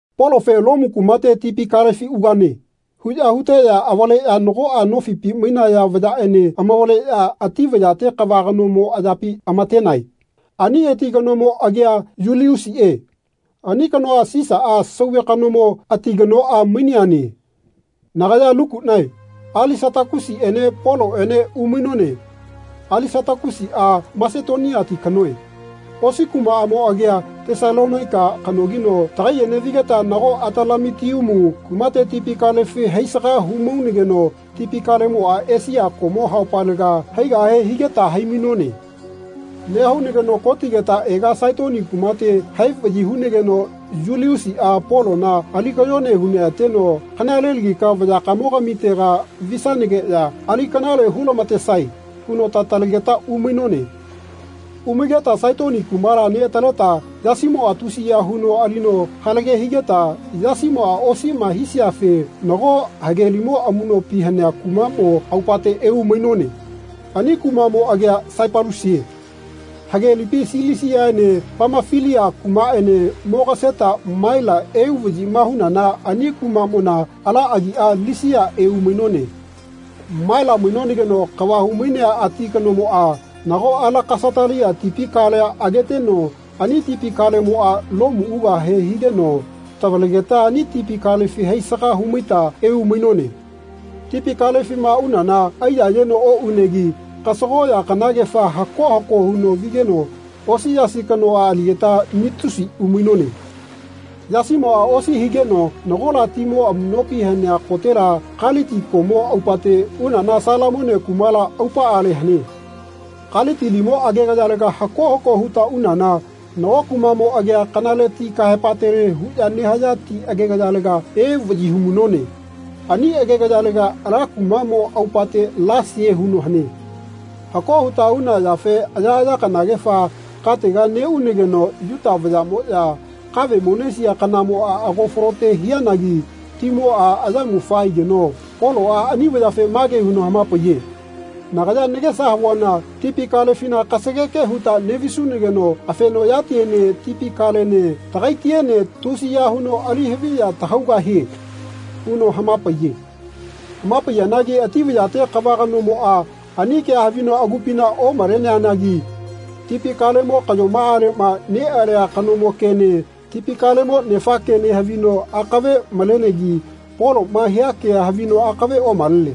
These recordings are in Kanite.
Polofe “Lomu kumate tipi kalefi ugane.” huꞌya huteꞌya avaleꞌya nagoꞌa nofipi mainaya vayaꞌene amavaleꞌya ati vayate kava kanomo ayapi amatenae. Ani ati kanomo agia Yuliusiꞌe. Ani kanoa Sisaꞌa, Sauve kanomo, ati kanoꞌa maineane. Nagaya Lukuꞌnae Alisatakusiꞌene Poloꞌene umainone. Alisatakusiꞌa Masetoniati kanoe. Osi kumaꞌamo agia Tesalonaika kanogino tagaiꞌene vigeta nago Atalamitiumu kumate tipi kalefi haisaga humaunageno tipi kalemoꞌa Esia koꞌmo haopalega haigahe higeta hai-mainone. Nehaunageno kotigeta ega Saitoni kumate hai vaꞌyi hunageno Yuliusiꞌa Polona ali kayone huneꞌateno “Kanalelagika vayakamogamitega visanageꞌya ali kanale hulamatesae.” huno tatalegeta umainone. Umaigeta Saitoni kumala neꞌataleta yasimoꞌa tusiya huno alino halage higeta yasimoꞌa osiꞌma hisiafe nago hagelimo amuꞌnopi hanea kumaꞌmo aupate eumainone. Ani kumaꞌmo agia Saipalusie. Hagelipi Silisiaene Pamafilia kumaꞌene mogaseta Maila euvaꞌyima hunana ani kumaꞌmona ala agiꞌa Lisia eumainone. Maila mainonageno kava humainea ati kanomoꞌa nago Alekasatalia tipi kalea ageteno ani tipi kalemoꞌa Lomu ugahe higeno tavalegeta ani tipi kalefi haisaga humaita eumainone. Tipi kalefima unana aiyayeno oꞌunegi kasagoꞌya kanagefa hako hako huno vigeno osi yasi kanoꞌa aligeta Nitusi umainone. Yasimoꞌa osi higeno nagola timo amuꞌnopi hanea kotega Kaliti koꞌmo aupate unana Salamone kumala aupaꞌale hane. Kaliti limo agegayalega hako hako huta unana nago kumaꞌmo agia Kanale Ti kahaepatele huꞌya nehaya ti agegayalega euvaꞌyi humainone. Ani agegayalega ala kumaꞌmo aupate Lasie huno hane. Hako huta una yafe ayaꞌaya kanagefa katega neꞌunageno Yuta vayaꞌmoꞌya kave monesiya kanamoꞌa ago falote hianagi timoꞌa ayamufa aigeno Poloꞌa ani vayafe mage huno hamapaiye, “Nagaya nagesa havuana tipi kalefina kasageke huta neꞌvisunageno afenoꞌyatiene tipi kalene tagaitiene tusiya huno alihaviya tahaugahie.” huno hamapaiye. Hamapaiyanagi ati vayate kava kanomoꞌa ani kea havino agupina omaleanagi tipi kalemo kaꞌyomaꞌaleꞌma neꞌalia kanomo kene tipi kalemo nefa kene havino akave malenegi Poloꞌma hia kea havino akave omalene.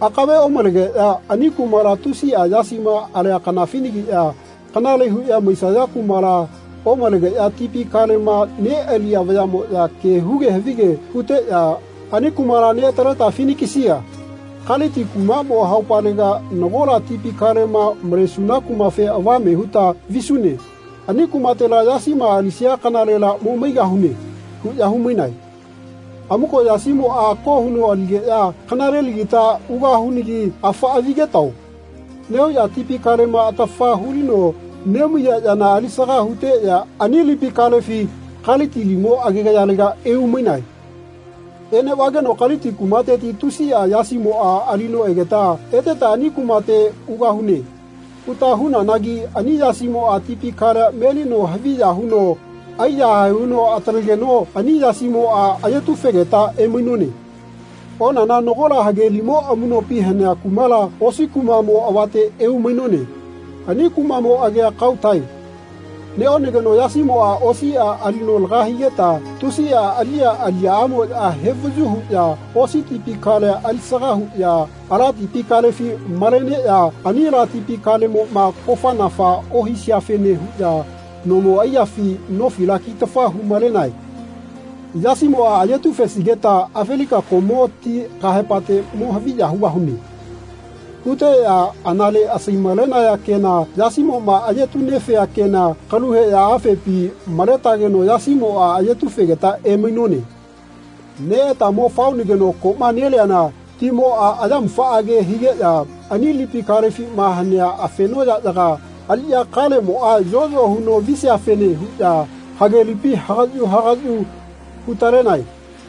Akave omalegeꞌya ani kumala tusiꞌa yasima alia kanafinagiꞌya kanale huꞌya maisaya kumala omalegeꞌya tipi kalema neꞌaliya vayaꞌmoꞌya ke huge havige huteꞌya “Ani kumala neꞌataleta Finikisia, Kaliti kumaꞌmo haupalega nagola tipi kalema malesuna kumafe avame huta visune. Ani kumatela yasima alisia kanalela mo maigahune.” huꞌya humainae. Amuko yasimoꞌa ako huno aligeꞌya “Kanalelagita ugahunagi afaꞌa vigetao.” nehuꞌya tipi kalema atafa hulino nemaiya yana alisaga huteꞌya ani lipi kalea Kaliti limo agegayalega eumainae. Eneꞌvageno Kaliti kumateti tusiꞌa yasimoꞌa alino egeta “Eteta ani kumate ugahune.” huta hunanagi ani yasimoꞌa tipi kalea melino haviya huno aiyahae huno atalegeno ani yasimoꞌa ayetufegeta emainone. Onana nagola hage limo amuꞌnopi hanea kumala osi kumaꞌmo avate eumainone. Ani kumaꞌmo agia Kautae. Neꞌonageno yasimoꞌa osiꞌa alino laga higeta tusi aliꞌya aliyaꞌamoꞌya hevayu huꞌya osi tipi kalea alisaga huꞌya ala tipi kalefi maleneꞌya ani ala tipi kalemoꞌma kofa-nafa ohiseafene huꞌya nomo aiyafi nofila kitafa humalenae. “Yasimoꞌa ayetufesigeta Afelika koꞌmo ti kahaepatega mo haviya hugahune.” huteꞌya anale asai-malenaya kena yasimoꞌma ayetu-nefea kena kalu heꞌya afepi maletageno yasimoꞌa ayetu-fegeta emainone. Neꞌeta mo faonageno koꞌma neliana timoꞌa ayamufaꞌage higeꞌya ani lipi kalefima hanea afenoꞌyaꞌyaga aliꞌya kalemoꞌa yoꞌyo huno visiafene huꞌya hage lipi hagaꞌyu hagaꞌyu hu-talenae.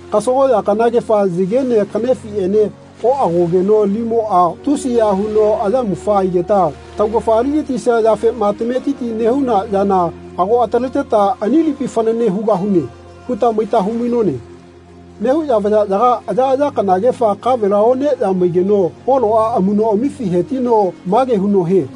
Kasagoꞌya kanagefa yagene kaꞌnefiꞌenena oꞌagogeno limoꞌa tusiya huno ayamufa aigeta taugafa aligatisia yafema tametiti nehuna yana ago ataleta “Ani lipi fanane hugahune.” huta maita humainone. Nehuꞌya vayaꞌyaga ayaꞌaya kanagefa kavela oneꞌya maigeno Poloꞌa amuꞌnoꞌamifi hetino mage huno hie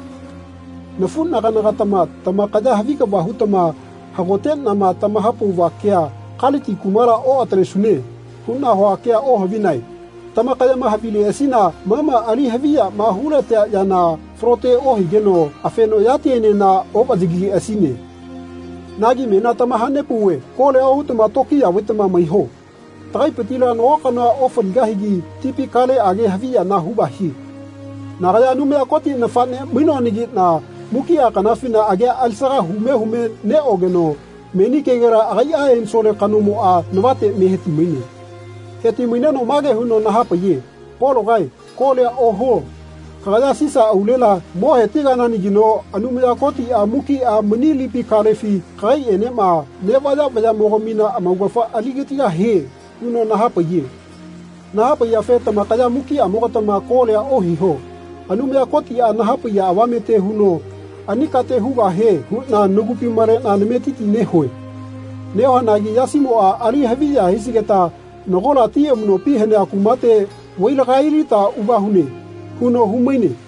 “Nafuꞌnaganagatama tamakaya havi kava hutama hagoteꞌnama tamahapauva kea ‘Kaliti kumala oꞌatalesune.’ huꞌna hua kea ohavinae. Tamakayama havileꞌasina ma ma ali haviyama hulatea yana falote ohigeno afenoꞌyatienena oꞌvaꞌyagileꞌasine. Nagi menia tamahanepauve kolia ohutama tokiya vaitama maiho. Tagaipitila nago kanoa ofaligahigi tipi kaleꞌage haviyana hugahie. Nagaya Anumaya Koti nafaꞌne mainoanagiꞌna mukiꞌa kanafina agia alisaga hume hume neꞌogeno meni kegela agaiꞌa ensole kanomoꞌa navate me heti-maine. Heti-maineno mage huno nahapaiye ‘Pologae kolia ohuo. Kagaya Sisa aulela mo hetigananagino Anumaya Kotiꞌa mukiꞌa mani lipi kalefi kagaiꞌenema neꞌvaya vayaꞌmogamina amaugafa aligatigahie.’ huno nahapaiye. Nahapaiyafe tamakaya mukiꞌamogatama kolia ohiho. Anumaya Kotiꞌa nahapaiya avamete huno ani kate hugahie huꞌna nagupi maleꞌna nametiti nehue. Nehuanagi yasimoꞌa ali haviya hisigeta nagola ti amuꞌnopi hanea kumate vailagailita ugahune.” huno humaine.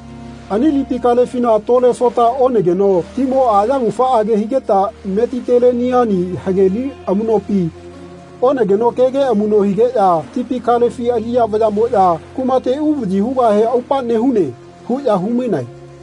Ani tipi kalefina tole sota onageno timoꞌa ayamufaꞌage higeta Metiteleniani hage li amuꞌnopi onageno kege amuꞌno higeꞌya tipi kalefi aliꞌya vayaꞌmoꞌya “Kumate uvaꞌyi hugahe aupa nehune.” huꞌya humainae.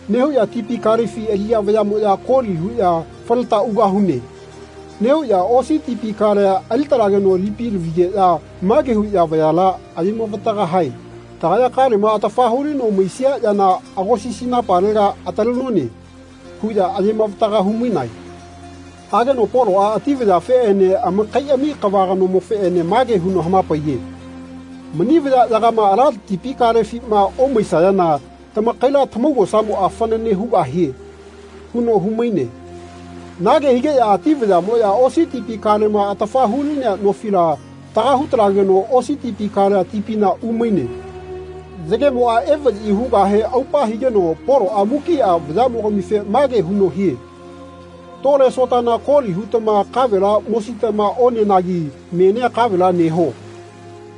Nehuꞌya tipi kalefi aliꞌya vayaꞌmoꞌya koli huꞌya “Faleta ugahune.” nehuꞌya osi tipi kalea ali-talageno lipi lavigeꞌya mage huꞌya vayala ayemavataga hae “Tagaya kalema atafa hulino maisia yana agosisinapalega atalenone.” huꞌya ayemavataga humainae. Hageno Poloꞌa ati vayafeꞌene amakaiꞌami kava kanomofeꞌene mage huno hamapaiye “Mani vayaꞌyagama ala tipi kalefima omaisayana tamakaila tamaugosamoꞌa fanane hugahie.” huno humaine. Nage higeꞌya ati vayaꞌmoꞌya osi tipi kalema atafa hulinea nofila taga hutalageno osi tipi kalea tipina umaine. Yagemoꞌa evaꞌyi hugahe aupa higeno Poloꞌa mukiꞌa vayaꞌmogamife mage huno hie “Tole sotana koli hutama kavela mositama onenagi menia kavela neho.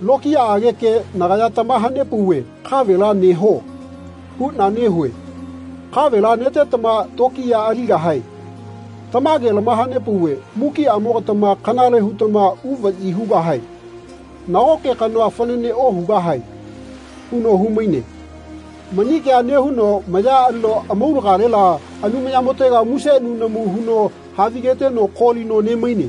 Lokiyaꞌage ke nagaya tamahanepauve ‘Kavela neho.’ huꞌna nehue. Kavela netetama tokiya aligahae. Tamage lamahanepauve mukiꞌamogatama kanale hutama uvaꞌyi hugahae. Nagoke kanoa fanane ohugahae.” huno humaine. Mani kea nehuno maya alino amaulagale Anumayamotega muse nunamu huno havigeteno kolino nemaine.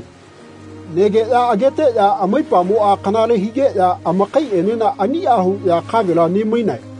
Negeꞌya ageteꞌya amaipamoꞌa kanale higeꞌya amakaiꞌenena aniꞌa huꞌya kavela ne-mainae.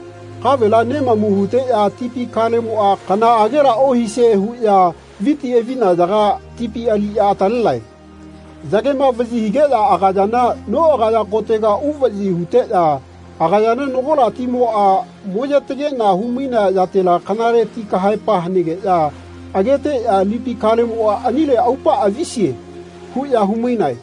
Kavela nemamu huteꞌya tipi kalemoꞌa kanaꞌagela ohisie huꞌya viti avinayaga tipi aliꞌya atalenae. Yagema vaꞌyi higeꞌya agayana noꞌagaya kotega uvaꞌyi huteꞌya agayana nagola timoꞌa moyetagena humainea yatela kanale ti kahaepa hanegeꞌya ageteꞌya “Lipi kalemoꞌa anile aupaꞌa visie.” huꞌya humainae.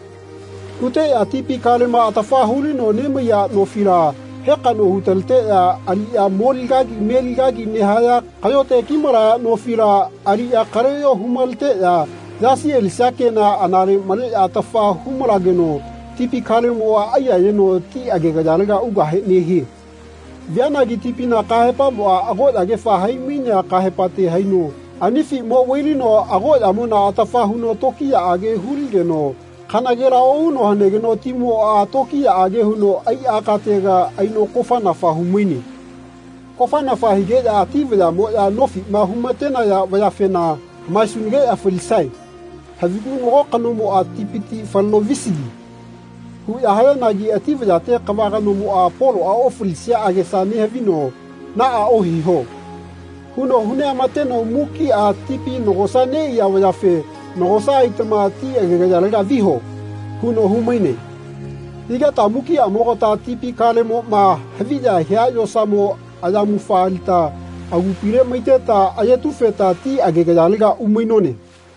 Huteꞌya tipi kalema atafa hulino nemaiya nofila hekaꞌno hutaleteꞌya aliꞌya moli kagi meli kagi nehaya kaꞌyote kimalaya nofila aliꞌya kaleꞌyo humaleteꞌya yasi alisia kena anale maleꞌya atafa humalageno tipi kalemoꞌa aiyayeno ti agegayalega ugahe nehie. Vianagi tipina kahaepamoꞌa agoꞌyagefa hai-mainea kahaepate haino anifi mo vailino agoꞌyamona atafa huno tokiyaꞌage huligeno kanagela ohuno hanegeno timoꞌa tokiyaꞌage huno aiꞌa katega aino kofanafa humaine. Kofanafa higeꞌya ati vayaꞌmoꞌya nofiꞌma humatenaya vayafena “Hamaesunageꞌya falisae. Havigu nago kanomoꞌa tipiti faleno visigi.” huꞌya hayanagi ati vayate kava kanomoꞌa Poloꞌa ofalisia agesa nehavino “Naꞌa ohiho.” huno huneꞌama-teno mukiꞌa tipi nagosa neꞌaiya vayafe “Nagosa aitama ti agegayalega viho.” huno humaine. Higeta mukiꞌamogata tipi kalemoꞌma haviya hia yosamo ayamufa alita agupile maiteta ayetufeta ti agegayalega umainone.